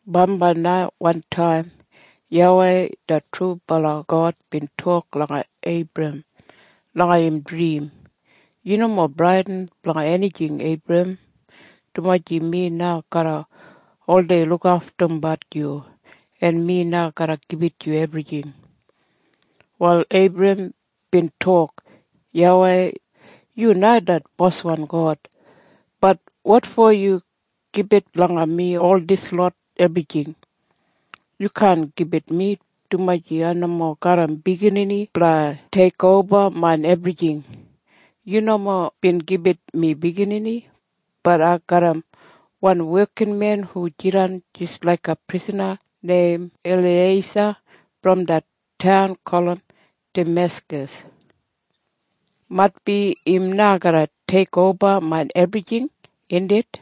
Bambai na wantaim YAWEI det trubala God bin tok langa Eibram langa im drim, “Yu nomo bradin blanga enijing Eibram, dumaji mi na garra oldei lukaftumbat yu, en mi na garra gibit yu ebrijing.” Wal Eibram bin tok, “YAWEI, yu na det boswan God. Bat wotfo yu gibit langa mi ol dislot ebrijing? Yu kaan gibit mi, dumaji ai nomo garram biginini blanga teikoba main ebrijing. Yu nomo bin gibit mi biginini. Bat ai garram wan wekinmen hu jidan jis laiga prisana neim Eliyeisa brom det taun gulum Dameskas. Maitbi im na garra teikoba main ebrijing, indit?”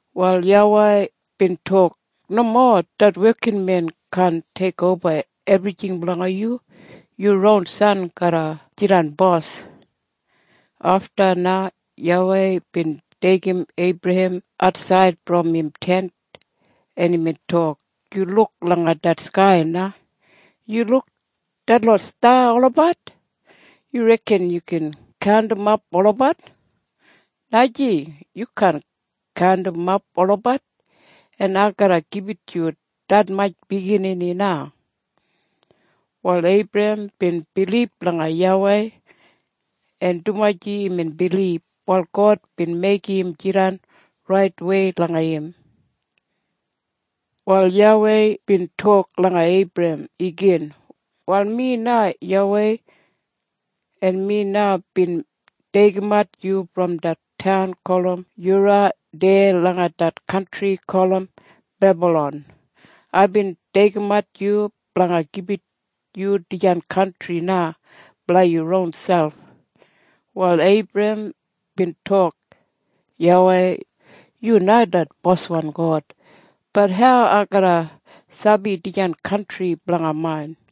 Wal YAWEI bin tok, “Nomo. Det wekinmen kaan teikoba ebrijing blanga yu. Yu ron san garra jidan bos.” Afta na YAWEI bin deigim Eibram atsaid brom im tent, en imbin tok, “Yu luk langa det skai na. Yu luk detlot sta olabat? Yu reken yu gin kaundimap olabat? Najing. Yu kaan kaundimap olabat. En ai garra gibit yu detmatj biginini na.” Wal Eibram bin bilib langa YAWEI, en dumaji imbin bilib, wal God bin meigim im jidan raitwei langa im. Wal YAWEI bin tok langa Eibram igin, “Wal mi na YAWEI, en mi na bin deigimat yu brom det taun gulum Yura deya langa det kantri gulum Bebalon. Aibin deigimat yu blanga gibit yu dijan kantri na blanga yu ronselp.” Wal Eibram bin tok, “YAWEI, yu na det boswan God. Bat hau ai garra sabi dijan kantri blanga main?”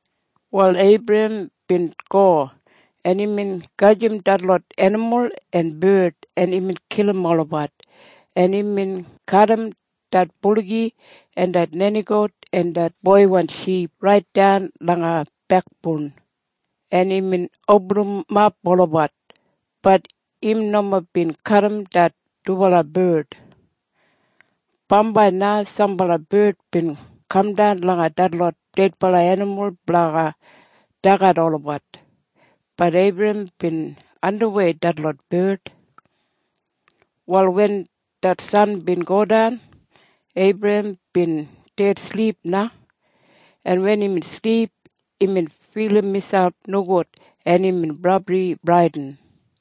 Wal Eibram bin go, en imbin gajim detlot enimul en bard, en imbin kilim olabat, en imbin kadim det buligi en det nenigout en det ship raitdan langa bekboun, en imbin opinimat olabat. Bat im nomo bin kadim det dubala bard. Bambai na sambala bard bin kamdan langa detlot dedbala enimul blanga dagat olabat. Bat Eibram bin andimwei detlot bard. Wal wen det san bin godan, Eibram bin dedsilip na, en wen imbin silip, imbin filim miselp nogud, en imbin brabli bradin.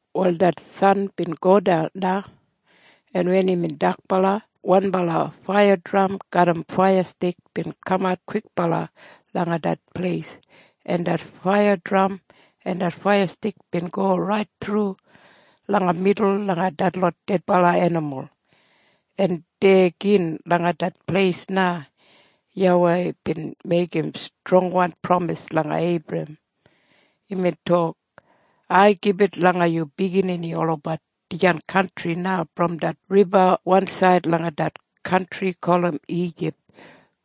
Wal det san bin godan na, en wen imbin dakbala, wanbala faiyadram garram faiyastik bin kamat kwikbala langa det pleis, en det faiyadram en det faiyastik bin go rait thru langa midul langa detlot dedbala enimul. En deya gin langa det pleis na YAWEI bin meigim strongwan pramis langa Eibram. Imbin tok, “Ai gibit langa yu biginini olabat dijan kantri na brom det riba wansaid langa det kantri gulum Ijip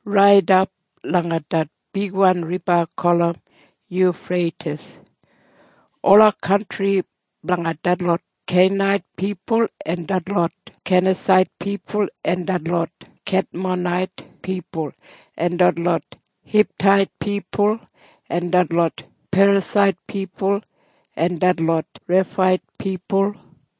raidap langa det bigwan riba gulum Yufreitis. Ola kantri blanga detlot Kenait pipul en detlot Kenasait pipul en detlot Kedmonait pipul en detlot Hitait pipul en detlot Perasait pipul en detlot Reifait pipul